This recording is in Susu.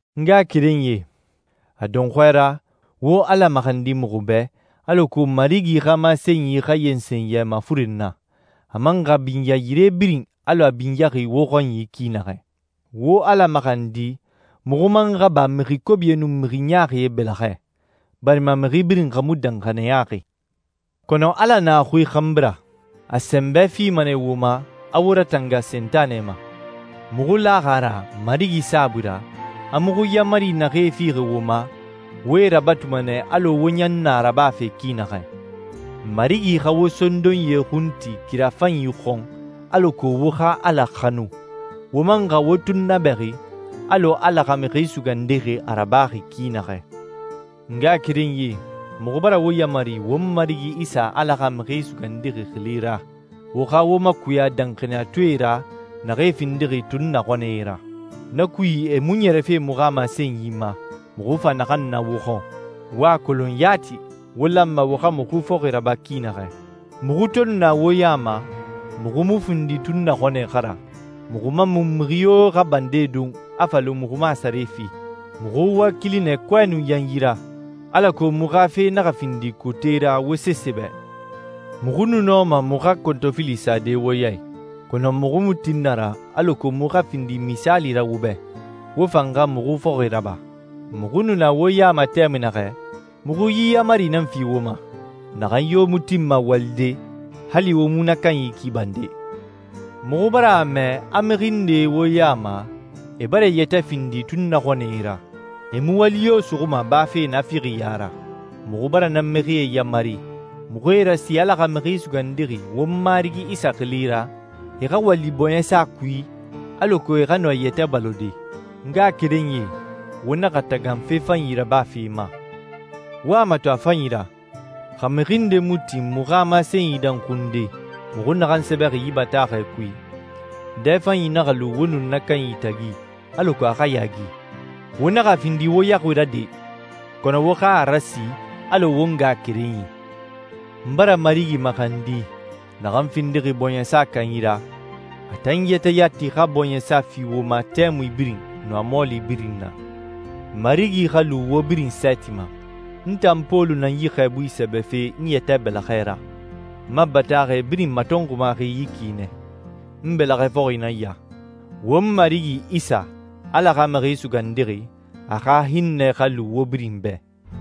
N ngaxakerenyie, a dɔnxɔɛ ra, wo Ala maxandi muxu bɛ alako Marigi xa masenyi xa yensen yɛ mafuren na, a man xa binya yire birin alɔ a binyaxi wo xɔnyi ki naxɛ. Wo Ala maxandi muxu man xa ba mixi kobie nun mixi ɲaaxie bɛlɛxɛ, barima mixi birin xa mu danxaniyaxi. Kɔnɔ Ala na a xui xanbi ra. A sɛnbɛ fima nɛ wo ma, a wo ratanga Sentanɛ ma. Muxu laxi a ra Marigi saabui ra, a muxu yaamari naxee fixi wo ma, wo e rabatuma nɛ alɔ wo ɲan na rabafe ki naxɛ. Marigi xa wo sondonyie xun ti kira fanyi xɔn alako wo xa Ala xanu, wo man xa wo tunnabɛxi alɔ Ala xa Mixi Sugandixi a rabaxi ki naxɛ. N ngaxakerenyie, muxu bara wo yamari won Marigi Isa Ala xa Mixi Sugandixi xili ra wo xa wo makuya danxaniyatɔɛe ra naxee findixi tunnaxɔnɛe ra. Na kui, e mu ɲɛrɛfe muxu xa masenyi ma muxu fa naxan na wo xɔn. Wo a kolon yati wo lanma wo xa muxu fɔxi raba ki naxɛ. Muxu to nu na wo ya ma muxu mu findi tunnaxɔnɛe xa ra, muxu man mu mixi yo xa bande don a fa lu muxu mu a sare fi. Muxu wakili nɛ kɔɛ nun yanyi ra, alako muxu xa fe naxa findi kote ra wo sese bɛ. Muxu nu nɔma muxu xa kɔntɔfili sade wo ya i, kɔnɔ muxu mu tin na ra alako muxu xa findi misaali ra wo bɛ, wo fan xa muxu fɔxi raba. Muxu nu na wo ya ma tɛmui naxɛ, muxu yi yaamari nan fi wo ma: «Naxan yo mu tinma walide, hali wo mu na kanyi ki bande.» Muxu bara a mɛ a mixi ndee wo ya ma e bara e yɛtɛ findi tunnaxɔnɛe ra. E mu wali yo suxuma bafe naafixiya ra. Muxu bara na mixie yamari, muxu e rasi Ala xa Mixi Sugandixi won Marigi Isa xili ra, e xa wali bɔɲɛsa kui alako e xa nɔ e yɛtɛ balode. N ngaxakerenyie, wo naxa tagan fe fanyi rabafe ma. Wo a mato a fanyi ra, xa mixi nde mu tin muxu xa masenyi danxunde muxu naxan sɛbɛxi yi bataaxɛ kui, dɛfanyi naxa lu wo nun na kanyi tagi alako a xa yaagi. Wo naxa a findi wo yaxui ra de, kɔnɔ wo xa a rasi alɔ wo ngaxakerenyi. N bara Marigi maxandi naxan findixi bɔɲɛsa kanyi ra, a tan yɛtɛ yati xa bɔɲɛsa fi wo ma tɛmui birin nun a mɔɔli birin na. Marigi xa lu wo birin sɛɛti ma. N tan Pɔlu nan yi xɛɛbui sɛbɛfe n yɛtɛ bɛlɛxɛ ra. N ma bataaxɛ birin matɔnxumaxi yi ki nɛ. N bɛlɛxɛ fɔxi nan ya. Won Marigi Isa, Ala xa Mixi Sugandixi, a xa hinnɛ xa lu wo birin bɛ.